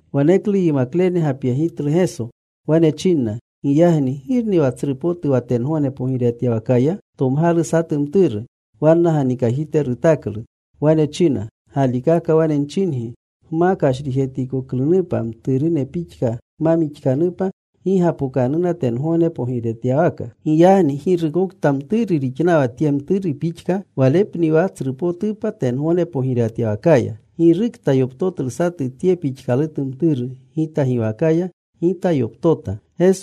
Waneklu yimaklene gapyetitlu Geso. Wane chinna, “Giyagni ¿girni wa tsru potu wa tengogne pogirewatyawakaya?” Tomgalu satu mturu. Wanna ganikajite rutaklu. Wane china, “Galikaka wane nchingi, gma kashrijetkoklunupa, mturune pixka gma mixkanupa, gi gapokanuna tengogne pogirewatyawaka. Giyagni girukokta mturu rixnawa tye mturu pixka, walepni wa tsrupotupa tengogne pogirewatyawakaya. Girukta yoptotlu satu tye pixkalutu mturu Gita giwakaya, Gita yoptota.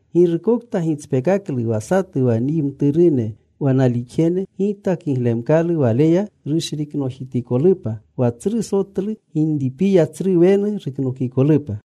“Girukokta gitspekaklu wa satu wa nyi mturune wa nalixjene Gita, kiglemkalu waleya rushriknojitikolupa wa tsru sotlu ginripiya, tsru wenu ruknokikolupa.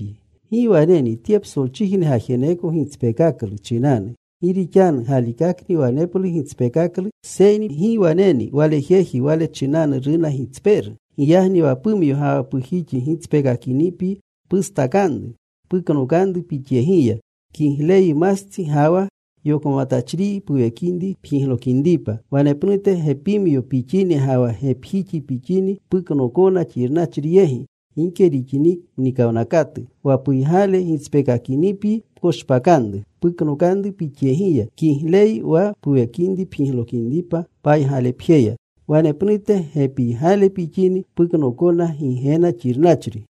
“¡Gi waneni tye psolchijne gajeneko gitspekaklu chinanu! Gi rixanu galikakni waneplu gitspekaklu, seyni ¡Gi waneni wale jeji wale chinanu runa gitspeeru! Giyagni wa pumyo ga wa pujixi gitspeekakinipyi pustakanru. Puknokanru pixyegiya. Kigleyyi mastsi ga wa yokmatachriyi puwekinri pjiglokinripa wanepnute gepimyo pixini ga wa gepjixi pixini, puknookona xirnachri yegi gike rixini mnikawnakatu. Wa puygale gitspeekakinipyi pkoshpakanru. Puknokanru pixyegiya. Kigleyyi wa puwekinri pjiglokinripa paygalepjeya wanepnute gepiygale pixini puknookona Gigena xirnachri.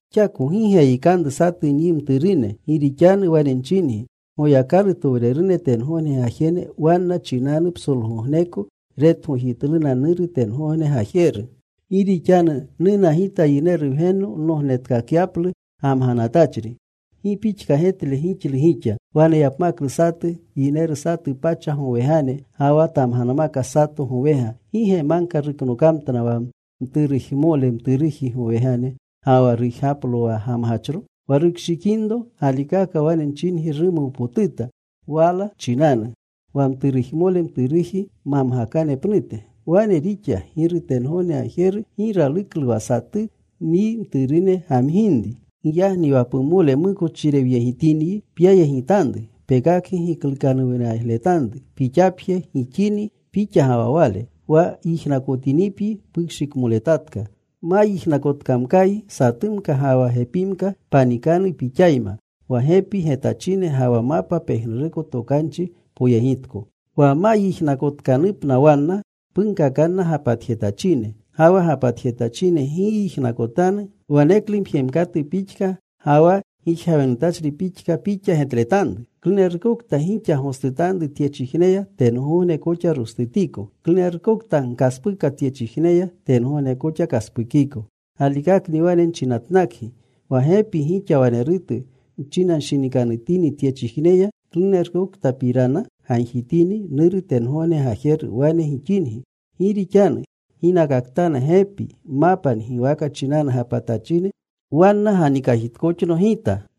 “Xako gi geyikanru satu nyi mturune, gi rixanu wane nchingi Goyakalutowrerune tengogne gajene wanna chinanu psolgogneko retgojitluna Nuru tengogne Gajeru. Gi rixanu nuna Gita Yineru Wgenno nognetkakapyaplu gamganatachri. “¿Gi pixka getle gixlu gixa? Waneyapmkalu satu yineru satu pacha gowegane ga wa tamganmaka sato gowega, ¿gi ge magka ruknokamtna wa mturujmole mturuji gowegane, ga wa rujgaplo wa gamgachro? Wa rukshikinro, galikaka wane nchingi rumuwpotuta wala chinanu, wa mturujmole mturuji mamgakane pnute. Wane rixa. Giru tengogne Gajeru gi raluklu wa satu nyi mturune gamginri. “Giyagni wa pumole mukochirewyegitinyi, pyayegitanru. Pekakgi giklukanuwnayegletanru gixapje gixini, pixa ga wa wale. Wa yijnakotinipyi, pukshikmoletatka. Ma yijnakotkamkayi satumka ga wa gepimka panikanu pixayma, wa gepi getachine ga wa mapa pejnuruko tokanchi poyegitko. Wa ma yijnakotkanupna wanna, punkakanna gapatjetachine. Ga wa gapatjetachine gi yijnakotanu waneklu mjemkatu pixka ga wa gijgawenutachri pixka pixa getletanru. “Klunerukokta gixa gostutanru tyechijneya, tengogne koxa rostutiko. Klunerukokta gkaspuka tyechijneya, tengogne koxa kaspukiko. “Galikakni wane nchinatnakgi, wa gepi gixa wanerutu nchinanshinikanutini tyechijneya, klunerukoktapirana gagjitini, Nuru tengogne Gajeru wane gixingi. Gi rixanu ginakaktana gepi, mapa ngiwaka chinanu gapatachine, wanna ganikajitkoxno Gita.”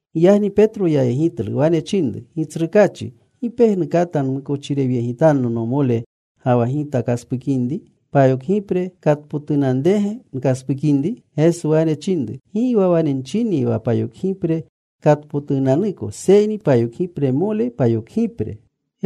Giyagni Petro yayegitlu. Wane chinru, “Gitsrukaachi, ¿gi pejnu kata mukochirewyegitanno nomole, ga wa gita kaspukinri? ¿Payokgipre katpotunanrege nkaspukinri?” Geso wane chinru, “Gi wane nchinyi wa payokgipre katpotunanuko, seyni payokgipremole payokgipre.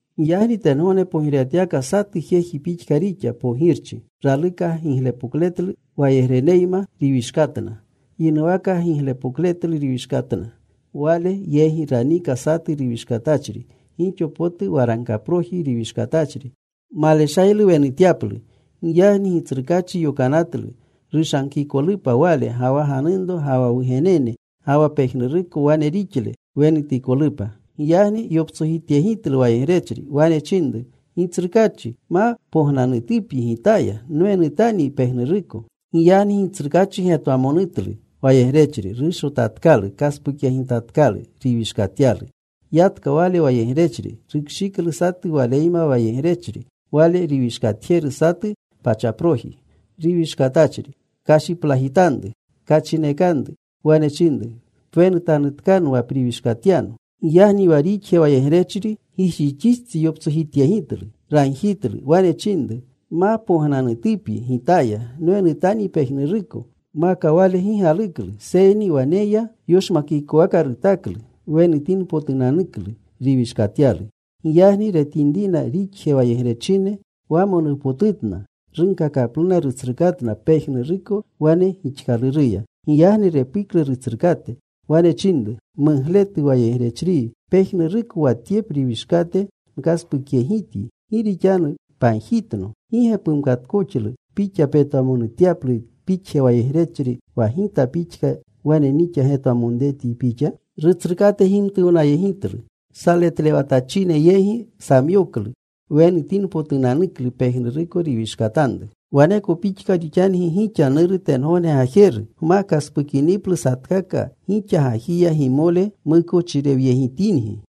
“Giyagni tengogne pogirewatyawaka satu jeji pixka rixa, pogirchi. Raluka giglepokletlu wayegreneyma riwishkatna. Yinuwaka giglepokletlu riwishkatna. Wale yegi raniika satu riwishkatachri. Gixo potu waragkaproji riwishkatachri. Maleshaylu wenutyaplu. Giyagni gitsrukaachi yokanatlu rushagkikolupa wale, ga wa ganunro, ga wa wugenene, ga wa pejnuruko wane rixle, wenutikolupa. “Giyagni yoptsojityegitlu wayegrechri. Wane chinru, ‘Gitsrukaachi, ma pognanutupyi gitaya. Nwenutanyi pejnuruko.’ Giyagni gitsrukaachi getwamonutlu wayegrechri. Rushotatkalu. Kaspukyegitatkalu riwishkatyalu. “Yatka wale wayegrechri. Rukshiklu satu waleyma wayegrechri, wale riwishkatjeru, satu pachaproji riwishkatachri. Kashiplajitanru. Kachinekanru. Wane chinru, ‘Pwenutanutkano wa priwishkatyano.’ “Giyagni wa rixje wayegrechri gijixistsi yoptsojityegitlu. Ragjitlu. Wane chinru, ‘Ma pognanutupyi gitaya. Nwenutanyi pejnuruko.’ “Maka wale gi galuklu. Seyni wane ya. Yoshmakikowaka rutaklu wenutinpotunanuklu riwishkatyalu. Giyagni retinrina rixje wayegrechine, wamonuwnapotutna. Runkakapluna rutsrukatna pejnuruko wane gixkaluruya. “Giyagni repuklu rutsrukate. Wane chinru, ‘Mugletu wayegrechriyi. Pejnuruko wa tye priwishkate nkaspukyegityi gi rixanu pagjitno. ¿Gi ge pumkatkoxlu pixa petwamonutyalu pixje wayegrechri, wa gita pixka wane nixa getwamonretyi pixa?’ “Rutsrukate gimtuwnayegitlu. Saletlewatachine yegi samyoklu wenutinpotunanuklu pejnuruko riwishkanatanru. “Waneko pixka rixangi gixa Nuru tengogne Gajeru, gma kaspukiniplu satkaka gixa gajiya gimole mukochirewyegitingi.”